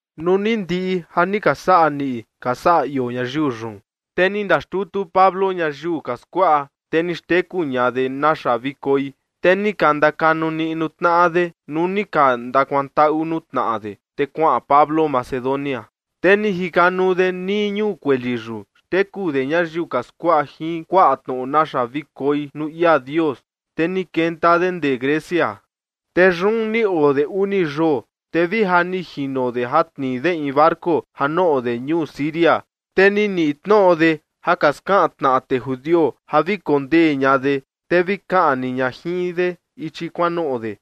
Nuu ni ndiꞌi ja ni ka saꞌa niꞌi ka saꞌa ioo ñayiu yun, te ni ndaxtutu Pablo ñayiu ka skuaꞌa, te ni xteku ña de naxa vi koi, te ni ka ndakanu niꞌnu tnaꞌa de nuu ni ka ndakuantaꞌu nuu tnaꞌa de, te kuaꞌan Pablo Macedonia. Te ni jikanuu de nii ñuu kueli yun, xteku de ñayiu ka skuaꞌa jin kuaꞌa tnoꞌo naxa vi koi nuu ia Dios, te ni kenta de ndee Grecia. Te yun ni oo de uni yoo, te vi ja ni jino de ja tnii de in barco ja noꞌo de ñuu Siria, te ni niꞌi tnoꞌo de ja ka skaꞌan tnaꞌa tee judio ja vi kondee ña de, te vi kaꞌni ña jin de ichi kuanoꞌo de.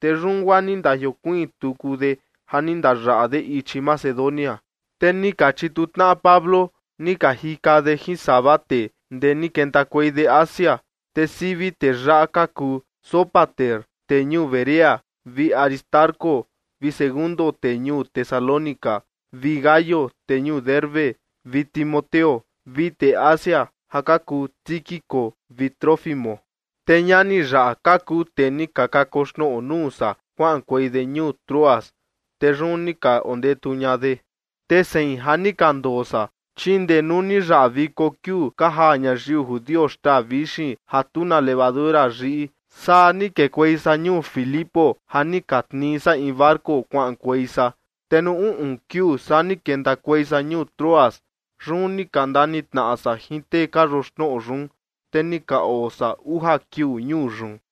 Te yun guaa ni ndajiokuiin tuku de ja ni ndayaꞌa de ichi Macedonia. Te ni ka chitu tnaꞌa Pablo, ni ka jika de jin sava tee, ndee ni kentakuei de Asia. Te sivi tee yaꞌa ka kuu Sópater tee ñuu Berea, vi Aristarco vi Segundo tee ñuu Tesalónica, vi Gayo tee ñuu Derbe, vi Timoteo, vi tee Asia ja ka kuu Tíquico vi Trófimo. Te ñani yaꞌa ka kuu tee ni ka kakoxnoꞌo nuu san kuaꞌankuei de ñuu Troas, te yun ni ka ondetu ña de. Te sein ja ni ka ndoo san, chi ndee nuu ni yaꞌa viko kiuu ka jaa ñayiu judio xtaa vixin ja tu na levadura yiꞌi, saa ni kekuei san ñuu Filipo ja ni ka tnii san in barco kuaꞌankuei san. Te nuu uꞌun kiuu saa ni kentakuei san ñuu Troas. Yun ni ka ndanitnaꞌa san jin tee ka yoxnoꞌo yun. Te ni ka oo san uja kiuu ñuu yun.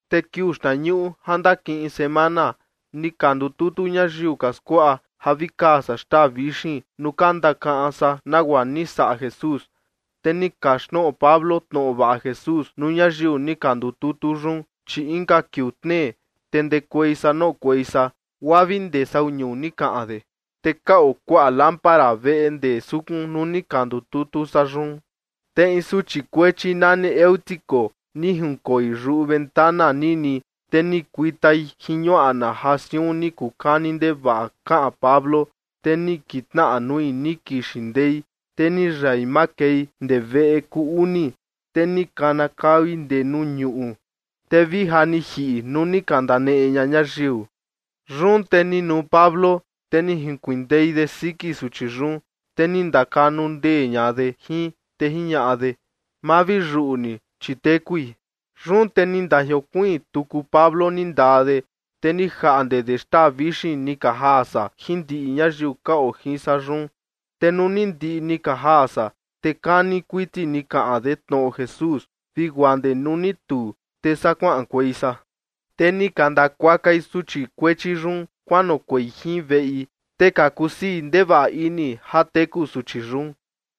Te kiuu xtnañuꞌu ja ndakiꞌin semana, ni ka ndututu ñayiu ka skuaꞌa ja vi kaa san xtaa vixin nuu ka ndakaꞌan san nagua ni saꞌa Jesús. Te ni kaxtnoꞌo Pablo tnoꞌo vaꞌa Jesús nuu ñayiu ni ka ndututu yun, chi inka kiuu tnee, te ndekuei san noꞌokuei san, guaa vi ndee sau ñuu ni kaꞌan de. Te ka oo kuaꞌa lámpara veꞌe ndee sukun nuu ni ka ndututu san yun. Te in suchi kuechi nani Eutico ni jinkoi yuꞌu ventana nini, te ni kuitai jin ñuaꞌna ja siun ni kuu kani ndevaꞌa kaꞌan Pablo. Te ni kitnaꞌa nui ni kixin ndei, te ni yai makei ndee veꞌe kuu uni, te ni kanakaui ndee nuu ñuꞌu, te vi ja ni jiꞌi nuu ni ka ndaneꞌe ña ñayiu. Yun te ni nuu Pablo, te ni junkuindei de siki suchi yun, te ni ndakanu ndee ña de jin, te jiñaꞌa de: ―Ma vi yuꞌu ni, chi tekui. Yun te ni ndajiokuiin tuku Pablo ni ndaa de, te ni jaꞌnde de xtaa vixin ni ka jaa san jin ndiꞌi ñayiu ka oo jin san yun. Te nuu ni ndiꞌi ni ka jaa san, te kani kuiti ni kaꞌan de tnoꞌo Jesús vi guaa ndee nuu ni tuu, te saa kuaꞌankuei san. Te ni ka ndakuakai suchi kuechi yun kuanoꞌokuei jin veꞌi, te ka kusii ndevaꞌa ini ja teku suchi yun.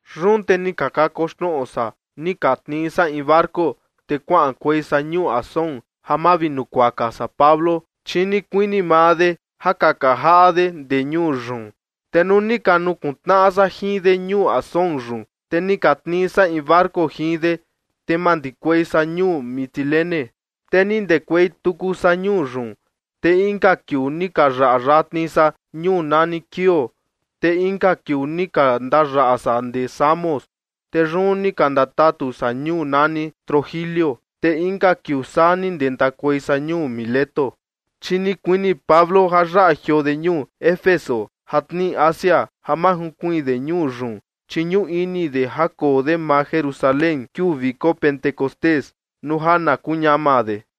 Yun te ni ka kakoxnoꞌo san ni ka tnii san in barco, te kuaꞌankuei san ñuu Asón ja mavinukuaka san Pablo, chi ni kuini maa de ja kaka jaꞌa de ndee ñuu yun. Te nuu ni ka nukuntnaꞌa san jin de ñuu Asón yun, te ni ka tnii san in barco jin de, te mandikuei san ñuu Mitilene. Te ni ndekuei tuku san ñuu yun, te inka kiuu ni ka ndayaꞌa yatni san ñuu nani Quío, te inka kiuu ni ka ndayaꞌa san ndee Samos. Te yun ni ka ndatatu san ñuu nani Trogilio. Te inka kiuu saa ni ndentakuei san ñuu Mileto. Chi ni kuini Pablo ja yaꞌa jioo de ñuu Éfeso ja tnii Asia ja ma junkuiin de ñuu yun, chi ñuꞌu ini de ja koo de maa Jerusalén kiuu viko Pentecostés, nuu ja na kuu ñama de.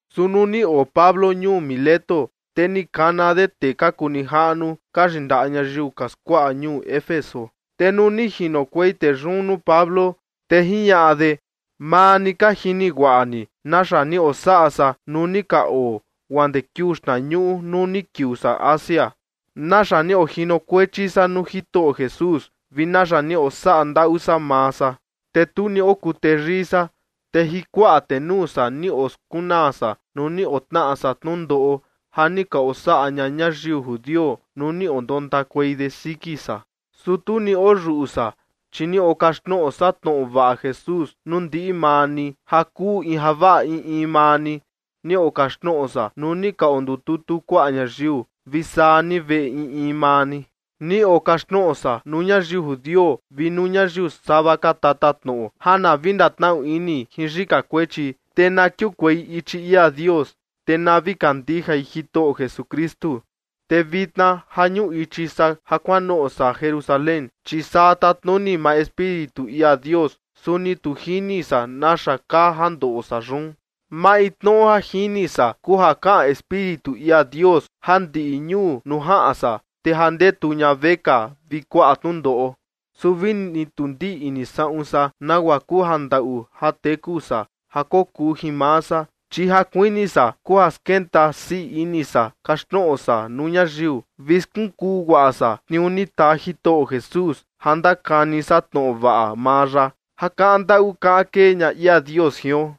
Su nuu ni oo Pablo ñuu Mileto, te ni kana de tee ka kuu nijaꞌnu ka yindaꞌa ñayiu ka skuaꞌa ñuu Éfeso. Te nuu ni jinokuei tee yun nuu Pablo, te jiñaꞌa de: ―Maa ni ka jini guaꞌa ni naxa ni osaꞌa san nuu ni ka oo, guaa ndee kiuu xtnañuꞌu nuu ni kiuu san Asia, naxa ni ojinokuechi san nuu Jitoꞌo Jesús vi naxa ni osaꞌa ndaꞌu san maa san. Te tu ni okuu teyii san. Te jin kuaꞌa tenuu san ni oskunaa san nuu ni otnaꞌa san tnundoꞌo, ja ni ka osaꞌa ña ñayiu judio nuu ni ondontakuei de siki san. Su tu ni oyuꞌu san, chi ni okaxtnoꞌo san tnoꞌo vaꞌa Jesús nuu ndiꞌi maa ni ja kuu in javaꞌa in in maa ni. Ni okaxtnoꞌo san nuu ni ka ondututu kuaꞌa ñayiu, vi saa ni veꞌe in in maa ni. Ni okaxtnoꞌo san nuu ñayiu judio vi nuu ñayiu sava ka tatatnoꞌo ja na vi ndatnaꞌu ini jin yika kuechi, te na kiukuei ichi ia Dios, te na vi kandijai Jitoꞌo Jesukristu. Te vitna ja ñuꞌu ichi san ja kuanoꞌo san Jerusalén, chi saa tatnuni maa Espíritu ia Dios. Su ni tu jini san naxa kaa ja ndoꞌo san yun. Maintnoꞌo ja jini san kuu ja kaꞌan Espíritu ia Dios ja ndiꞌi ñuu nuu jaꞌan san, te ja ndetu ña vekaa vi kuaꞌa tnundoꞌo. Su vini tu ndiꞌni saꞌun san nagua kuu ja ndaꞌu ja teku san ja kokuu jin maa san, chi ja kuini san kuu ja skenta sii ini san kaxtnoꞌo san nuu ñayiu, vi skunkuu guaꞌa san tniuu ni taa Jitoꞌo Jesús ja ndakani san tnoꞌo vaꞌa maa ya ja kaꞌan ndaꞌu kaꞌan kee ña ia Dios jion.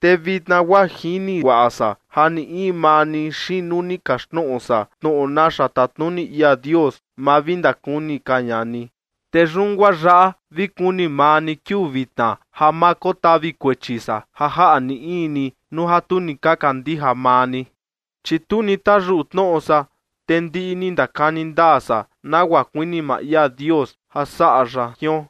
’Te vitna guaa ja jini guaꞌa san ja ni in maa ni xiin nuu ni kaxtnoꞌo san tnoꞌo naxa tatnuni ia Dios, ma vi ndakuni ka ña ni. Te yun guaa yaꞌa vi kuni maa ni kiuu vitna ja ma kotavi kuechi san ja jaꞌa ni in ni nuu ja tu ni ka kandija maa ni. Chi tu ni tayuꞌu tnoꞌo san, te ndiꞌi ni ndakani ndaa san nagua kuini maa ia Dios ja saꞌa ya jion.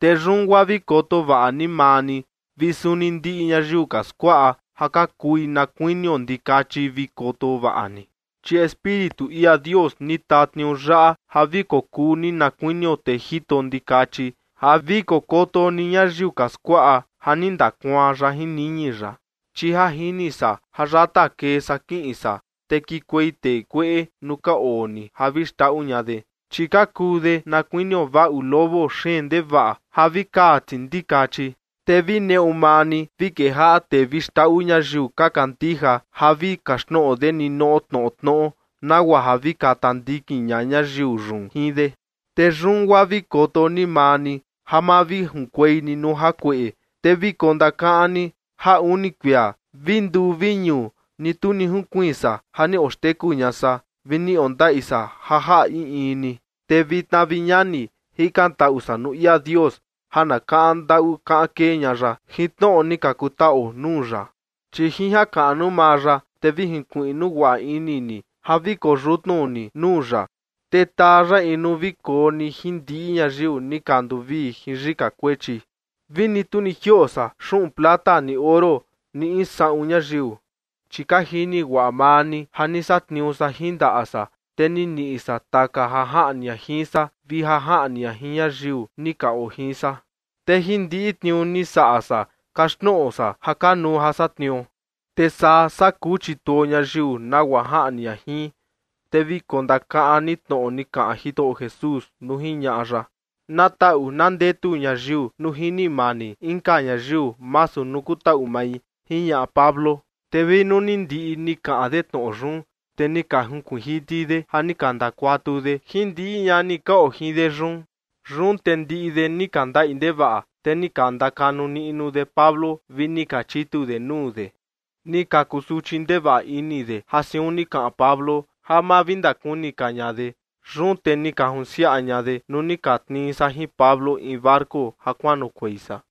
Te yun guaa vi koto vaꞌa ni maa ni, vi suni ndiꞌi ñayiu ka skuaꞌa ja ka kui na kuinio ndikachi vi koto vaꞌa ni. Chi Espíritu ia Dios ni taa tniuu yaꞌa ja vi kokuu ni na kuinio tee jito ndikachi ja vi kokoto ni ñayiu ka skuaꞌa ja ni ndakuaan ya jin niñi ya. Chi ja jini san ja yata kee san kiꞌin san, te kikuei tee kueꞌe nuu ka oo ni ja vi xndaꞌu ña de. Chi ka kuu de na kuinio vaꞌu lobo xeen ndevaꞌa ja vi kaa ti ndikachi. Te vi neꞌu maa ni vi kejaꞌa tee vi xndaꞌu ñayiu ka kandija ja vi kaxtnoꞌo de ninoꞌo tnoꞌo tnoꞌo, nagua ja vi kata ndikin ña ñayiu yun jin de. Te yun guaa vi koto ni maa ni ja ma vi junkuei ni nuu jakueꞌe. Te vi kondakaꞌan ni ja uni kuia, vi nduu vi ñuu, ni tu ni junkuiin san ja ni oxteku ña san vi ni ondaꞌi san ja jaꞌa in in ni. ’Te vitna, vi ñani, jikantaꞌu san nuu ia Dios ja na kaꞌan ndaꞌu kaꞌan kee ña ya jin tnoꞌo ni ka kutaꞌuo nuu ya. Chi jin jakaꞌnu maa ya, te vi jinkuiꞌnu guaꞌa ini ni ja vi koyutnu ni nuu ya, te taa ya in nuu vi koo ni jin ndiꞌi ñayiu ni ka nduvii jin yika kuechi. Vi ni tu ni jioꞌo san xuꞌun plata ni oro ni in saꞌun ñayiu. Chi ka jini guaꞌa maa ni ja ni satniuu san jin ndaꞌa san, te ni niꞌi san taka ja jaꞌni ña jin san vi ja jaꞌni ña jin ñayiu ni ka oo jin san. Te jin ndiꞌi tniuu ni saꞌa san kaxtnoꞌo san ja kanuu ja satniuo. Te saa saa kuu chituo ñayiu nagua jaꞌni ña jin. Te vi kondakaꞌan ni tnoꞌo ni kaꞌan Jitoꞌo Jesús nuu jiñaꞌa ya: “Na taꞌu na ndetu ñayiu nuu jini mani inka ñayiu masu nuu kutaꞌu mai” ―jiñaꞌa Pablo. Te vi nuu ni ndiꞌi ni kaꞌan de tnoꞌo yun, te ni ka junkuiin jiti de ja ni ka ndakuatu de jin ndiꞌi ñani ka oo jin de yun. Yun te ndiꞌi de ni ka ndaꞌi ndevaꞌa. Te ni ka ndakanu niꞌnu de Pablo vi ni ka chitu de nuu de. Ni ka kusuchi ndevaꞌa ini de ja siun ni kaꞌan Pablo ja ma vi ndakuni ka ña de. Yun te ni ka junsiaꞌa ña de nuu ni ka tnii san jin Pablo in barco ja kuanoꞌokuei san.